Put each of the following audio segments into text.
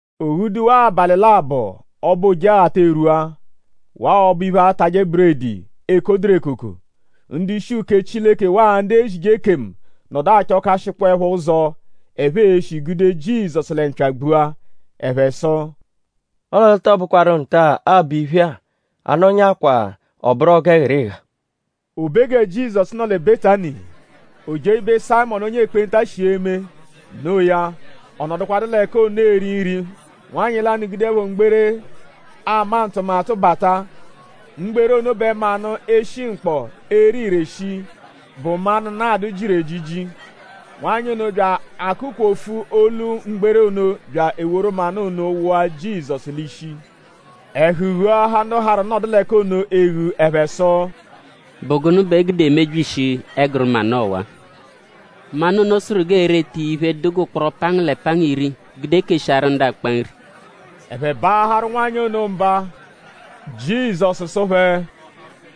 O ghuduwaa abalị labọ; ọbo Ojeghata erwua; waa ọbo-iphe aatajẹ buredi, ekoduru ekoko. Ndu-ishi uke Chileke waa ndu ezije ekemu nọdu achọkashikpoepho ụzo, ẹphe e-shi gude Jizọsu lẹ mpya gbua. Ẹphe sụ: “Ọle ọ tọo bụkwaru nta-a, aabọ iphe-a; a -nọnyakwaa ọ bụru ọgu ẹghirigha.” O be gẹ Jizọsu nọ lẹ Betani; o jee ibe Sayịmonu onye ekpenta shi eme. Noo ya; ọ nọdukwadu l'ẹka ono eri nri; nwanyị lanụ gudeẹpho mgbere, ama ntụmatu bata. Mgbere ono bẹ manụ, eshi mkpọ, ere ire shii, bụ manụ-nadụ jiru ejiji. Nwanyị ono bya akụ-kwofuẹpho olu mgbere ono bya eworu manụ ono wụa Jizọsu l'ishi. Ẹhu ghuahaa ndu harụ nọdu l'ẹka ono eghu. Ẹphe sụ: “?Bụ gụnu bẹ e gude emebyishi ẹguru manụ ọwa? Manụ ono sụru g'ee-reta iya iphe, dụ g'ụkporo pangu lẹ pangu iri gude keshiaru ndu akpa nri.” Ẹphe baaharụ nwanyị ono mba. Jizọsu sụ phẹ: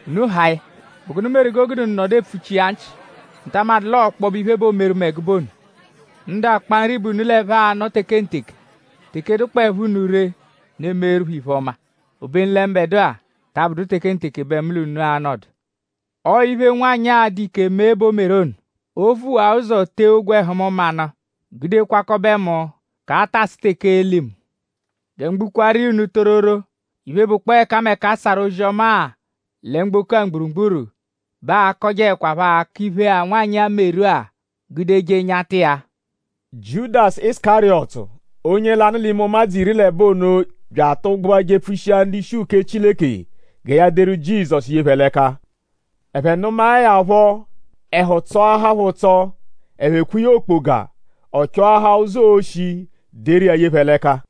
“Unu haa ya.?Bụ gụnu meru g'o gude unu nọdu epfuchi iya nchị??Unu ta amadụ l'ọo ọkpobe iphe bẹ o meru mu ẹgube ono? Ndu akpa nri bẹ unu l'ẹphe anọ tekenteke; teke dụkpoepho unu ree; unu emeeru phẹ iphe-ọma. Obenu lẹ mbẹdua ta abụdu tekenteke bẹ mu l'unu a-nọdu. Ọo iphe, nwanyị-a a-dụ ike mee bẹ o meru ono. O vuwaa ụzo tee ogwẹhu mu manụ gude kwakọbe mu k'a -ta asụ teke ee-li mu. Gẹ mu gbukwaaru iya unu tororo; iphe, bụkpoo ẹkameka, a sarụ ozi-ọma-a lẹ mgboko-a mgburugburu bẹ aa-kọjeekwapho akọ iphe-a, nwanyị-a meru-a gudeje nyata iya.” Jiudasu Isukariyọtu, onye lanụ l'ime ụmadzu iri l'ẹbo ono bya atụgbua jepfushia ndu-ishi uke Chileke gẹ ya deru Jizọsu ye phẹ l'ẹka. Ẹphe nụmae ya phọ; ẹhu tsọahaa phẹ ụtso. Ẹphe kwee ya okpoga. Ọ chọahaa ụzo, oo-shi deru iya ye phẹ l'ẹka.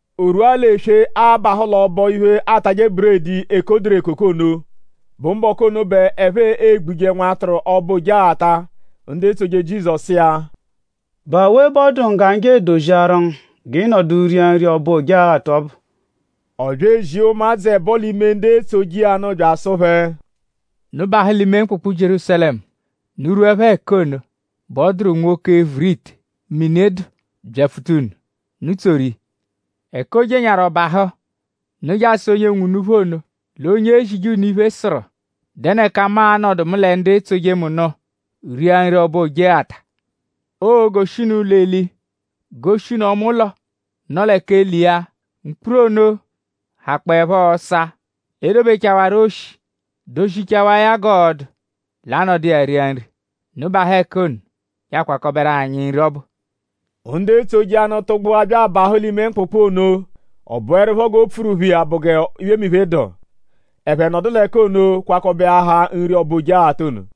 O rwua l'eswe, abahụ l'ọbo-iphe, aatajẹ buredi, ekoduru ekoko ono, bụ mbọku ono bẹ ẹphe egbuje nwatụru ọbo Ojeghata; ndu etsoje Jizọsu sụ iya: “?Bụ awe bẹ ọ dụ ngu g'anyi je edoziaru ngu g'ị nọdu ria nri ọbo Ojeghata ọbu?” Ọ bya ezia ụmadzu ẹbo l'ime ndu etsoje iya nụ bya asụ phẹ: “Unu bahụ l'ime mkpụkpu Jierúsalẹmu. Unu -rwuẹpho ẹka ono bẹ ọ dụru nwoke, e-vuru ite, mini dụ byapfuta unu. Unu tsoru iya. Ẹka o jenyaaru ọ bahụ; unu je asụ onye nwe unuphu ono l'onye ezije unu iphe sụru: ‘?Dẹnu ẹka mu a-nọdu mu lẹ ndu etsoje mu nụ ria nri ọbo Ojeghata?’ Oo-goshi unu ụlo-eli; goshi unu ọma ụlo, nọ lẹ k'eli iya; mkpuru ono hakpọepho ọsa, e dobechawaru oshi; dozichawaa ya g'ọo-du; l'a nọdu iya ria nri. Unu bahụ ẹka ono je akwakọberu anyi nri ọbu.” Ndu etsoje iya nụ tụgbua bya abahụ l'ime mkpụkpu ono. Ọ bụerupho g'o pfuru phẹ iya bụ g'iphemiphe, dụ. Ẹphe nọdu l'ẹka ono kwakọbeahaa nri ọbo Ojeghata ono.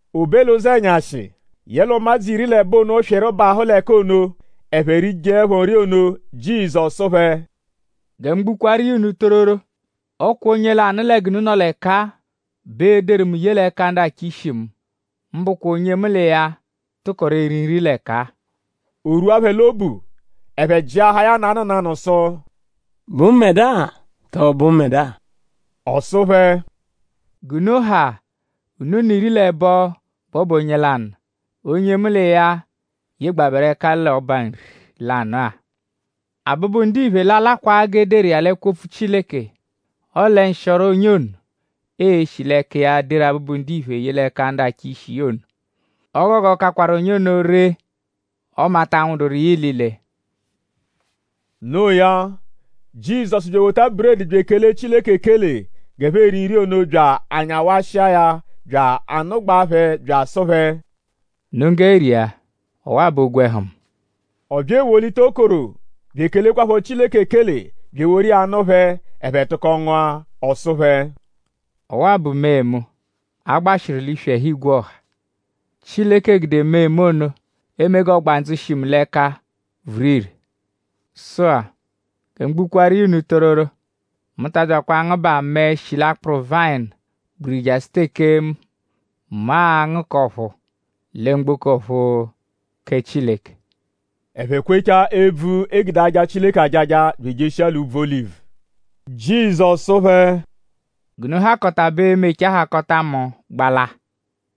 O be l'ụzenyashi; yẹle ụmadzu iri l'ẹbo ono swịru bahụ l'ẹka ono. Ẹphe rijeẹpho nri ono; Jizọsu sụ phẹ: “Gẹ mu gbukwaaru iya unu tororo; ọ kwa onye lanụ lẹ g'unu nọ l'ẹka-a bẹ l'e-deru mu ye l'ẹka ndu achọ ishi mu; mbụkwa onye mu l'iya tụkoru eri nri l'ẹka-a.” O rwua phẹ l'obu. Ẹphe jịahaa ya nanụ nanụ sụ: “?Bụ mbẹdua??Tọo bụ mbẹdua?” Ọ sụ phẹ: “G'unu ha unu n'iri l'ẹbo bẹ ọ bụ onye lanụ; onye mu l'iya yegbabẹru ẹka l'ọba-nri lanụ-a. Abụbu-Ndiphe l'a-lakwa g'e deru iya l'ẹkwo-opfu Chileke. Ọle nshịoro onye ono, ee-shi l'ẹka iya deru Abụbu-Ndiphe ye l'ẹka ndu achọ ishi iya ono. O gogo kakwaru onye ono ree; ọme a ta nwụduru iya ilile.” No iya; Jizọsu bya ewota buredi bya ekele Chileke ekele g'ẹphe eri nri ono bya anyawashia ya bya anụgbaa phẹ bya asụ phẹ: “Unu nggẹ ria. Ọwa-a bụ ogwẹhu mu.” Ọ bya ewolita okoro bya ekelekwaphọ Chileke ekele bya eworu iya nụ phẹ; ẹphe tụko ngụa. Ọ sụ phẹ: “Ọwa-a bụ mee mu, a gbashiru l'iswi ẹhu igwe ọha. Chileke gude mee mu ono eme g'ọgbandzu, shi mu l'ẹka vuru ire. Sụ-a; gẹ mu gbukwaaru iya unu tororo; mu ta abyakwa angụbaa mẹe, shi l'akpụru vayịnu gbiriri jasụ teke mu a-ngụ k'ọ̀phúú lẹ mgboko ọ̀phúú kẹ Chileke.” Ẹphe kwechaa ebvu, e gude aja Chileke ajaja; bya ejeshia l'úbvú Olivu. Jizọsu sụ phẹ: “G'unu hakọta bẹ e-mechaa hakọta mu gbala;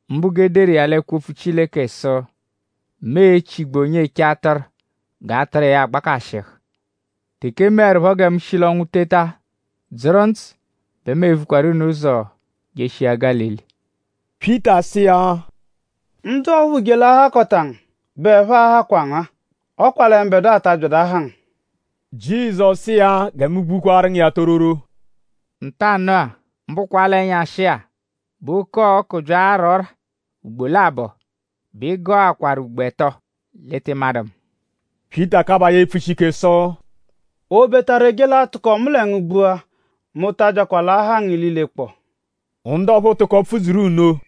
mbụ g'e deru iya l'ẹkwo-opfu Chileke sụ: ‘Mu e-chigbu onye eche atụru; g'atụru iya agbakashịhu.’ Teke e meẹrupho gẹ mu shi l'ọnwu teta dzụru ndzụ bẹ mu e-vukwaru unu ụzo jeshia Gálili.” Pyịta sụ iya: “Ndu ọphuu je l'a-hakọta ngu; bẹ ẹphe a-hakwa ngu; ọ kwa lẹ mbẹdua ta abyadụ aha ngu.” Jizọsu sụ iya: Gẹ mu gbukwaru ngu iya tororo; “Ntanụ-a; mbụkwa l'ẹnyashia bẹ oke-ọku bya ara ọ́rà ugbo labọ bẹ ị gọakwaru ugbo ẹto l'ị tị madụ mu.” Pyịta kabaa ya epfushi ike sụ: “Obetaru e je l'atụko mu lẹ ngu gbua; mu ta abyakwa l'aha ngu ililekpọo.” Ndu ọphuu tụko pfudzuru nno.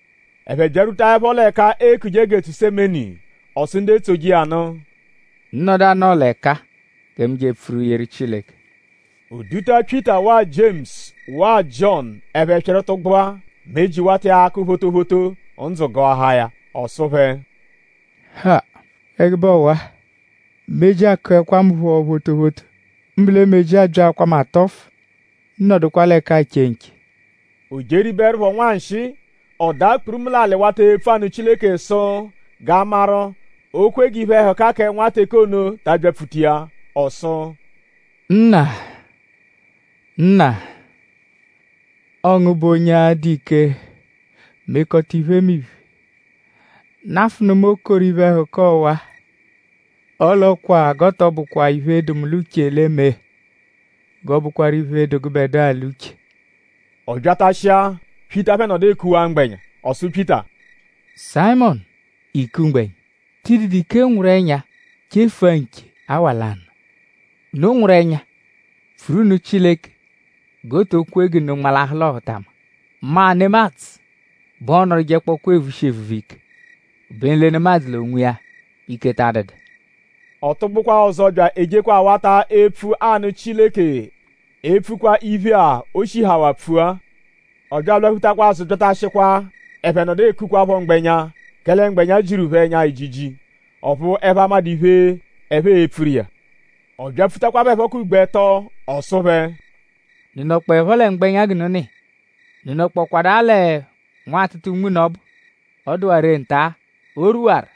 Ẹphe byarwutaẹpho l'ẹka eekuje Getusemeni; ọ sụ ndu etsoje iya nụ: “Unu nọdu anọo l'ẹka-a gẹ mu je epfuru yeru Chileke.” O duta Pyịta waa Jiemusu waa Jiọnu ẹphe swịru tụgbua; meji wata iya akụ photophoto; ndzụ gụahaa ya. Ọ sụ phẹ: “Ha; ẹgube ọwa! Meji akụekwa mu phọ photophoto; mbụ lẹ meji abyaakwaa mu atọfu. Unu nọdukwa l'ẹka-a che nche.” O jeribeẹrupho nwanshịi; ọ daa kpurumu l'alị wata epfu anụ Chileke sụ g'a maru:?oo-kwe g'iphe-ẹhuka kẹ nwa teke ono ta abyapfuta iya. Ọ sụ: “Nna; Nna; ọo ngu bụ onye a-dụ ike mekọta iphemiphe; nafụnu mu okoro iphe-ẹhuka ọwa-a! Ọle ọ kwa g'ọ tọ bụkwa iphe, dụ mu l'uche l'e-me; g'ọ bụkwaru iphe, dụ gụbedua l'uche.” Ọ byatashia; Pyịta phẹ nọdu ekuwaa mgbẹnya. Ọ sụ Pyịta: “Sayịmonu!?Iiku mgbẹnya??Tị dụdu ike nwụru ẹnya chefua nche awa lanụ? Unu nwụru ẹnya; pfuru nụ Chileke g'o to kwe g'unu nmalahụ l'ọhutama. Mma nemadzụ bẹ ọ nọdujekpokwaa evushi evuvu ike; obenu lẹ nemadzụ l'onwiya bẹ ike ta adụdu.” Ọ tụgbukwaa ọzo bya ejekwa awata epfu anụ Chileke epfukwa iphe-a, o shihawaa pfua. Ọ bya alwaphutakwa azụ byatashikwa; ẹphe nọdu ekukwaphọ mgbẹnya; kẹle mgbẹnya jiru phẹ ẹnya ejiji; ọphu ẹphe amadụ iphe, ẹphe e-pfuru iya. Ọ byapfutakwa phẹ phọ k'ugbo ẹto; ọ sụ phẹ: “?Unu nọkpoepho lẹ mgbẹnya g'unu nọ iya??Unu nọkpokwadaa lẹ nwatụta unme unu ọbu? Ọ dụwaa ree nta-a. O rwuwaru.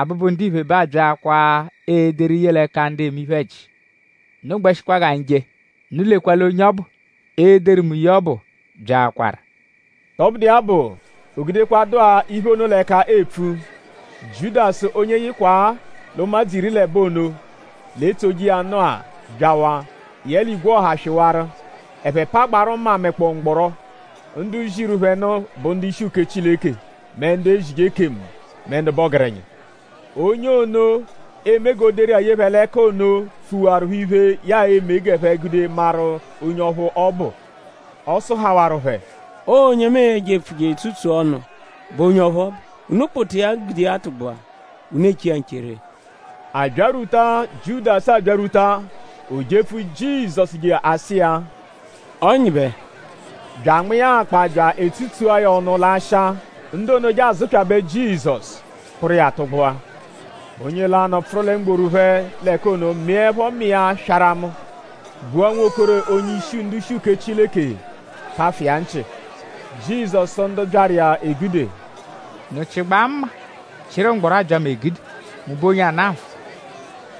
Abụbu-Ndiphe bẹ aabyaakwaa ederu ye l'ẹka ndu eme iphe-ẹji.” “Unu gbẹshikwa g'anyi je. Unu lekwa l'onye ọbu, e-deru mu ye ọbu byaakwaru.” Tọbudu iya bụ; o gudekwadụa iphe ono l'ẹka epfu; Jiudasu onye yịkwa-a l'ụmadzu iri l'ẹbo ono, l'etsoje iya nụ-a byawa. Yẹle igwe ọha swịwaru. Ẹphe pagbaarụ mma mẹkpoo mgbọro. Ndu ziru phẹ nụ bụ ndu-ishi uke Chileke mẹ ndu ezije ekemu mẹ ndu bụ ọgerenya. Onye ono, eme g'o deru iya ye phẹ l'ẹka onoya pfuwaru phẹ iphe, ya e-me g'ẹphe gude maru onye ọphu ọ bụ. Ọ sụhawaru phẹ: “Ọo onye mu e-jepfu je etsutsua ọnu bụ onye ọphu ọ bụ. Unu kpụta iya gude tụgbua; unu eche iya nche ree.” Abyarwuta, Jiudasu abyarwuta; o jepfu Jizọsu je asụ iya: “Ọnyibe!” Bya anma iya akpa tsutsua ya ọnu l'asha. Ndu ono je azụpyabe Jizọsu; kpụru iya tụgbua. Onye lanụ, pfụru lẹ mgboru phẹ l'ẹka ono mịepho mma iya swaramụ; gbua nwokoro onye-ishi ndu-ishi uke Chileke; pafụ iya nchị. Jizọsu sụ ndu byaru iya egude: “?Unu chịgbaa mma; chịru mgbọro abya mu egude??Mu bụ onye ana nfụ?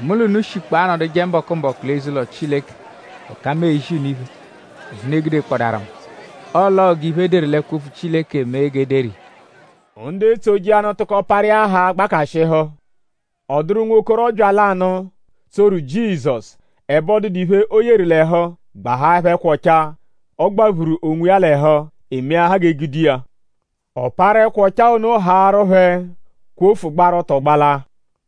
Mu l'unu shikpọo anọduje mbọku-mbọku l'eze-ụlo Chileke; ẹka mu ezi unu iphe; ọphu unu egudekpọdaaru mu. Ọle ọo g'iphe, e deru l'ẹkwo-opfu Chileke mee g'e deru iya.” Ndu etsoje iya nụ tụko parụ iya haa gbakashịhu. Ọ dụru nwokorọbya lanụ, tsoru Jizọsu. Ẹbe ọ dụdu iphe, o yeru l'ẹhu; gbahaẹpho ẹkwa ọchaa, ọ gbaphuru onwiya l'ẹhu. E meahaa g'e gude iya. Ọ parụ ẹkwa ọchaa ono haarụ phẹ; kwofu gbaru ọto gbalaa.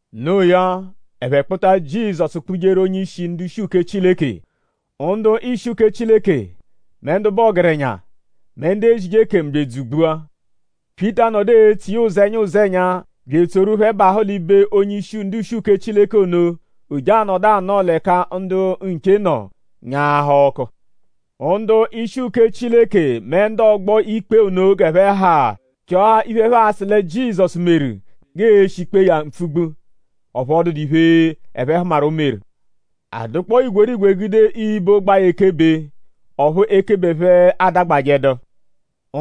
Noo ya; ẹphe kpụta Jizọsu kpụjeru onye-ishi ndu-ishi uke Chileke. Ndu-ishi uke Chileke; mẹ ndu bụ ọgerenya; mẹ ndu ezije ekemu bya edzugbua. Pyịta nọdu etso iya ụzenya ụzenya bya etsoru phẹ bahụ l'ibe onye-ishi ndu-ishi uke Chileke ono. O je anọdu anọo l'ẹka ndu nche nọ; nyaahaa ọku. Ndu-ishi uke Chileke mẹ ndu ọgbo-ikpe ono g'ẹphe ha chọahaa iphe, ẹphe a-sụ lẹ Jizọsu meru; g'ee-shi kpee ya mpfugbu; ọphu ọ dụdu iphe, ẹphe hụmaru, o meru. A dụkpoo igwerigwe gude ibo gbaa ya ekebe; ọphu ekebe phẹ adagbajẹdu.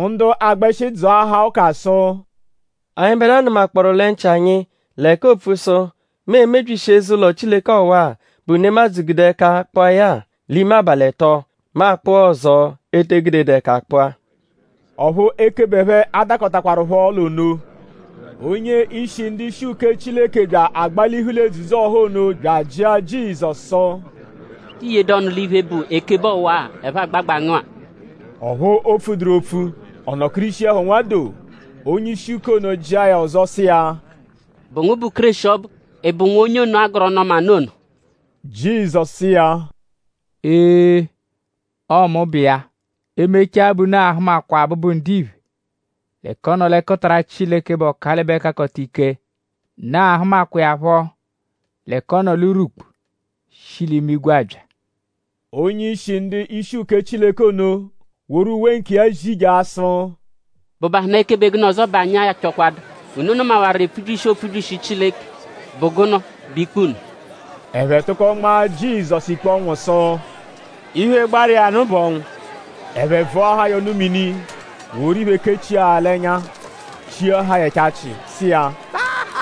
Ndu agbẹshi dzụahaa ụka sụ: Anyịbedua nụmakpooru lẹ nchị anyi l'ẹka oopfu sụ: “Mu e-mebyishi eze-ụlo Chileke ọwa-a, bụ nemadzụ gude ẹka kpụa ya-a; l'ime abalị ẹto; mu akpụa ọzo, ete egudedu ẹka kpụa.” Ọphu ekebe phẹ adakọtakwarupho l'ono. Onye-ishi ndu-ishi uke Chileke bya agbalihu l'edzudzu-ọha ono bya ajịa Jizọsu sụ: “?Tii yedu ọnu l'iphe, bụ ekebe ọwa-a, ẹphe agbagbaa ngu-a?” Ọphu o pfuduru opfu; ọ nọkirishiepho nwadoo. Onye-ishi uke ono jịa ya ọzo sụ iya: “?Bụ ngu bụ Kéreshi ọbu??Ị bụ Nwa Onye ono, a gọru Ọnu-ọma nụ ono?” Jizọsu sụ iya: “Ee; ọo mu bụ iya. E -mechaa bẹ unu a-hụmakwaa Abụbu-Ndiphe l'ẹka ọ nọ l'ẹkutara Chileke, bụ Ọkalibe-Kakọta-Ike. Unu ahụmakwa iya phọ l'ẹka ọ nọ l'urwukpu shi l'imigwe abya.” Onye-ishi ndu-ishi uke Chileke ono woru uwe nkiya zijaa sụ: “?Bụbahunaa ekebe gụnu ọzo bẹ anyi achọkwadu? ?Unu nụmawaru epfubyishi, oopfubyishi Chileke??Bụ gụnu bụ ikpe unu?” Ẹphe tụko nmaa Jizọsu ikpe ọnwu sụ: “Iphe, gbaru iya nụ bụ ọnwu.” Ẹphe vụahaa ya ọnu-mini; woru iphe kechia ya ẹnya; chiahaa ya ẹchachi; sụ iya: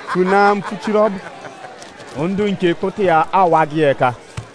“Pfunaa mpfuchiru ọbu!” Ndu nche kpụta iya awagọ iya ẹka.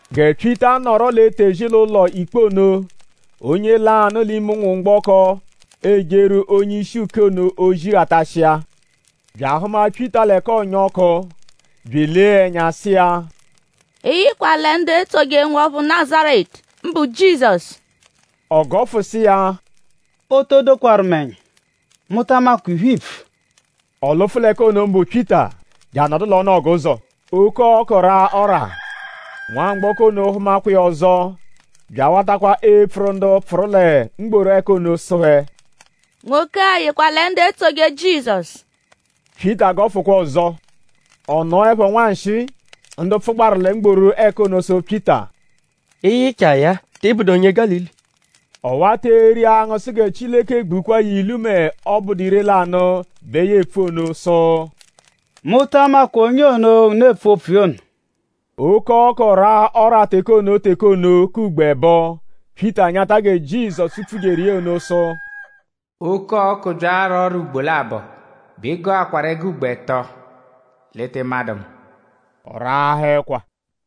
Gẹ Pyịta nọro l'etezi l'ụlo-ikpe ono; onye lanụ l'ime ụnwumgboko, ejeru onye-ishi uke ono ozi ghatashia; bya ahụma Pyịta l'ẹka ọonya ọku; bya elee ya ẹnya sụ iya: “Ị yịkwa lẹ ndu etsoje nwọphu Nazaretu; mbụ Jizọsu!” Ọ gọfu sụ iya: “O to dokwaru mu ẹnya! Mu ta amakwa iphe, iipfu.” Ọ lụfu l'ẹka ono mbụ Pyịta; je anọdu l'ọnu ọguzo. Oke-ọku raa ọ́rà. Nwamgbọko ono hụmakwa iya ọzo bya awatakwa epfuru ndu pfụru lẹ mgboru ẹka ono sụ phẹ: “Nwoke-a yịkwa lẹ ndu etsoje Jizọsu.” Pyịta gọfukwa ọzo. Ọ nọepho nwanshịi; ndu pfụgbaru lẹ mgboru ẹka ono sụ Pyịta: “Ị yịchaa ya-a.?Tị bụdu onye Gálili?” Ọ wata eri angụ sụ gẹ Chileke gbukwaa ya ilu mẹ ọ -bụdu ire-lanụ bẹ ya epfu ono; sụ: “Mu ta amakwa onye ono, unu epfu opfu iya ono.” Oke-ọku raa ọ́rà teke ono teke ono k'ugbo ẹbo. Pyịta nyata gẹ Jizọsu pfujeru ono sụ: “Oke-ọku bya ara ọ́rà ugbo labọ bẹ ị gọakwaru ẹgo ugbo ẹto l'ị tị madụ mu.” Ọ raahaa ẹkwa.